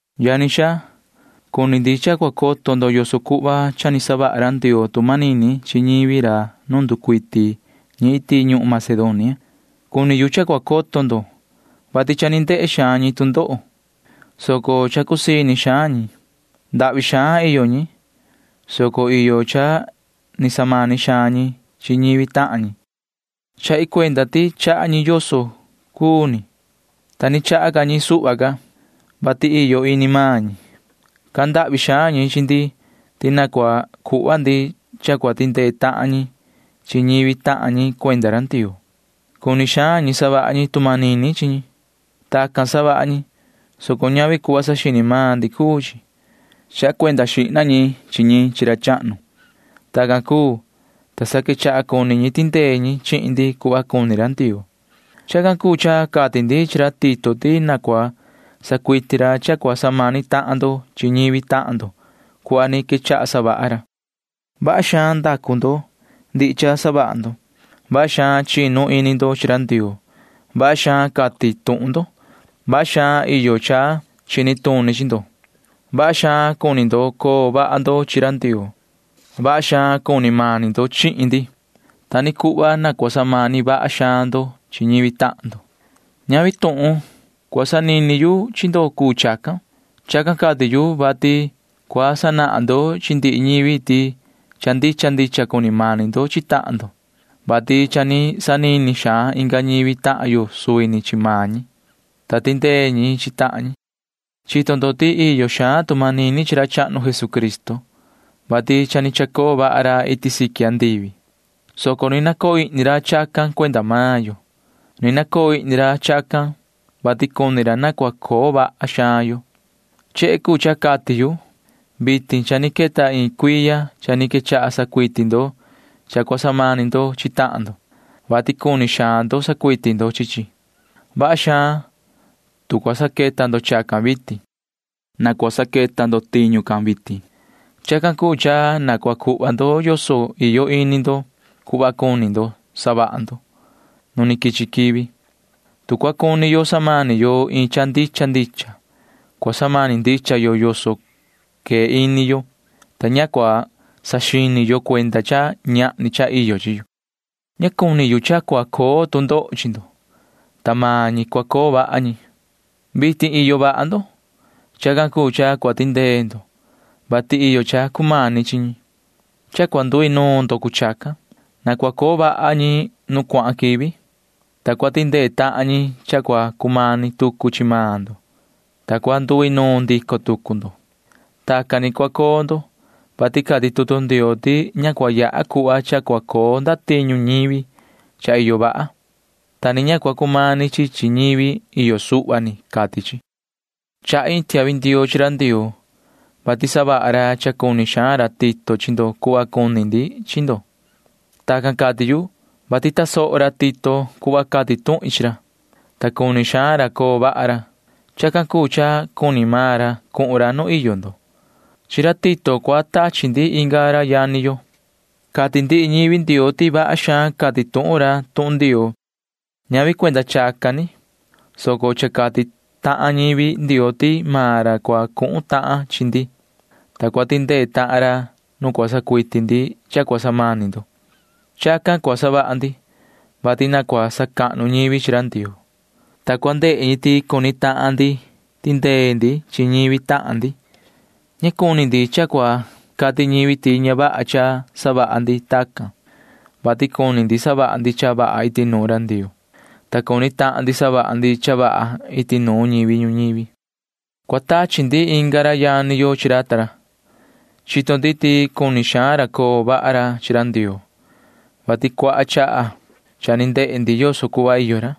Yani xaa, cuni ndi cha cua coto ndo yoso cuhva cha ni savaha ra Ndioo tu manini chi ñivi ra nu nducuiti ñi iti ñuhun Macedonia. Cuni yu cha cua coto ndo, vati cha ni ndehe xaan ñi tu ndoho, soco cha cusii ini xaan ñi. Ndahvi xaan iyo ñi, soco iyo cha ni samani xaan ñi chi ñivi tahan ñi. Chahi cuenda ti chaha ñi yoso cuu ni, ta ni chaha ca ñi suhva ca, vati iyo ini maan ñi. Cahan ndahvi xaan ñi chi ndi ti na cua cuhva ndi cha cua tindee tahan ñi chi ñivi tahan ñi cuenda ra Ndioo. Cuni xaan ñi savaha ñi tu manini chi ñi. Tacan savaha ñi, soco ñavi cuhva saxini maan ndi cuu chi. Chaha cuenda xihna ñi chi ñi chi ra chahnu. Tacan cuu, ta sa quechaha cuni ñi tindee ñi chihin ndi cuhva cuni ra Ndioo. Chacan cuu cha cati ndi chi ra Tito ti na cua sacuiti ra cha cua samani tahan ndo chi ñivi tahan ndo cuhva ni quechaha savaha ra. Vaha xaan ndacu ndo ndihi cha savaha ndo. Vaha xaan chinu ini ndo chi ra Ndioo. Vaha xaan cati tuhun ndo. Vaha xaan iyo cha chini tuni chi ndo. Vaha xaan cuni ndo coo vaha ndo chi ra Ndioo. Vaha xaan cuni mani ndo chihin ndi. Ta ni cuhva na cua samani vaha xaan ndo chi ñivi tahan ndo. Ñavi tuhun cua sanini yu chi ndo cuu chacan. Chacan cati yu, vati cua sanahan ndo chi ndihi ñivi ti cha ndicha ndicha cuni mani ndo chi tahan ndo, vati cha ni sanini xaan inga ñivi tahan yo suvi ni chi maan ñi, ta tindee ñi chi tahan ñi. Chito ndo ti iyo xaan tu manini chi ra chahnu Jesucristo, vati cha ni chacoo vaha ra iti siqui andivi, soco ni nacoo ihni ra chacan cuenda maan yo. Ni nacoo ihni ra chacan, vati cuni ra na cua coo vaha xaan yo. Chehe cuu cha cati yu. Vitin cha ni queta iin cuiya cha ni quechaha sacuiti ndo cha cua samani ndo chi tahan ndo, vati cuni xaan ndo sacuiti ndo chi chi. Vaha xaan, tu cua saqueta ndo chacan vitin. Na cua saqueta ndo tiñu can vitin. Chacan cuu cha na cua cuhva ndo yoso iyo ini ndo cuhva ni cuni ndo savaha ndo nu ni quichi quivi. Tu cua cuni yo samani yo iin cha ndicha ndicha, cua samani ndicha yo yoso quee ini yo, ta ña cua saxini yo cuenda cha ñahni cha iyo chi yo. Ña cuni yu cha cua coo tu ndoho chi ndo, ta maan ñi cua coo vaha ñi. Vitin iyo vaha ndo. Chacan cuu cha cua tindee ndo, vati iyo cha cumani chi ñi. Cha cua nduinuun ndo cuu chacan. Na cua coo vaha ñi nu cuahan quivi, ta cua tindee tahan ñi cha cua cumani tucu chi maan ndo, ta cua nduinuun ndico tucu ndo. Tacan ni cua coo ndo, vati cati tutu Ndioo ti ña cua yaha cuhva cha cua coo ndatiñu ñivi cha iyo vaha, ta ni ña cua cumani chi chi ñivi iyo suhva ni, cati chi. Chahi iin tiahvi ndioo chi ra Ndioo, vati savaha ra cha cuni xaan ra Tito chi ndo cuhva cuni ndi chi ndo. Tacan cati yu, vati tasoho ra Tito cuhva cati tuhin chi ra, ta cuni xaan ra coo vaha ra. Chacan cuu cha cuni maan ra cuhun ra nu iyo ndo. Chi ra Tito cua tachi ndi inga ra yani yo. Cati ndihi ñivi Ndioo ti vaha xaan cati tuhun ra tuhun Ndioo. Ñavi cuenda chacan ni, soco cha cati tahan ñivi Ndioo ti maan ra cua cuhun tahan chi ndi, ta cua tindee tahan ra nu cua sacuiti ndi cha cua samani ndo. Chacan cua savaha ndi, vati na cua sacahnu ñivi chi ra Ndioo, ta cua ndehe ñi ti cuni tahan ndi tindee ndi chi ñivi tahan ndi. Ña cuni ndi cha cua cati ñivi ti ña vaha cha savaha ndi tacan, vati cuni ndi savaha ndi cha vaha iti nuun ra Ndioo, ta cuni tahan ndi savaha ndi cha vaha iti nuun ñivi ñuñivi. Cua tachi ndi inga ra yani yo chi ra ta ra. Chito ndi ti cuni xaan ra coo vaha ra chi ra Ndioo, vati cuaha chaha cha ni ndehe ndi yoso cuhva iyo ra.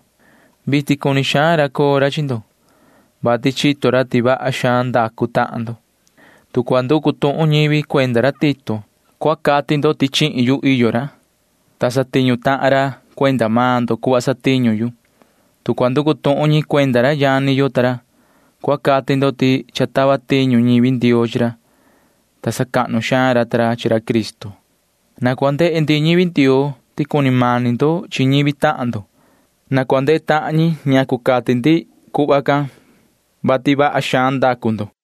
Vitin cuni xaan ra coo ra chi ndo, vati chito ra ti vaha xaan ndacu tahan ndo. Tu cua nducu tuhun ñivi cuenda ra Tito, cua cati ndo ti iyo ra chihin yu, ta satiñu tahan ra cuenda maan ndo cuhva satiñu yu. Tu cua nducu tuhun ñi cuenda ra yani yo ta ra, cua cati ndo ti cha tava tiñu ñivi Ndioo chi ra, ta sacahnu xaan ra ta ra chi ra Cristo. Na cua ndehe ndihi ñivi Ndioo ti cuni mani ndo chi ñivi tahan ndo. Na cua ndehe tahan ñi ñacu cati ndi ti vaha xaan ndacu ndo.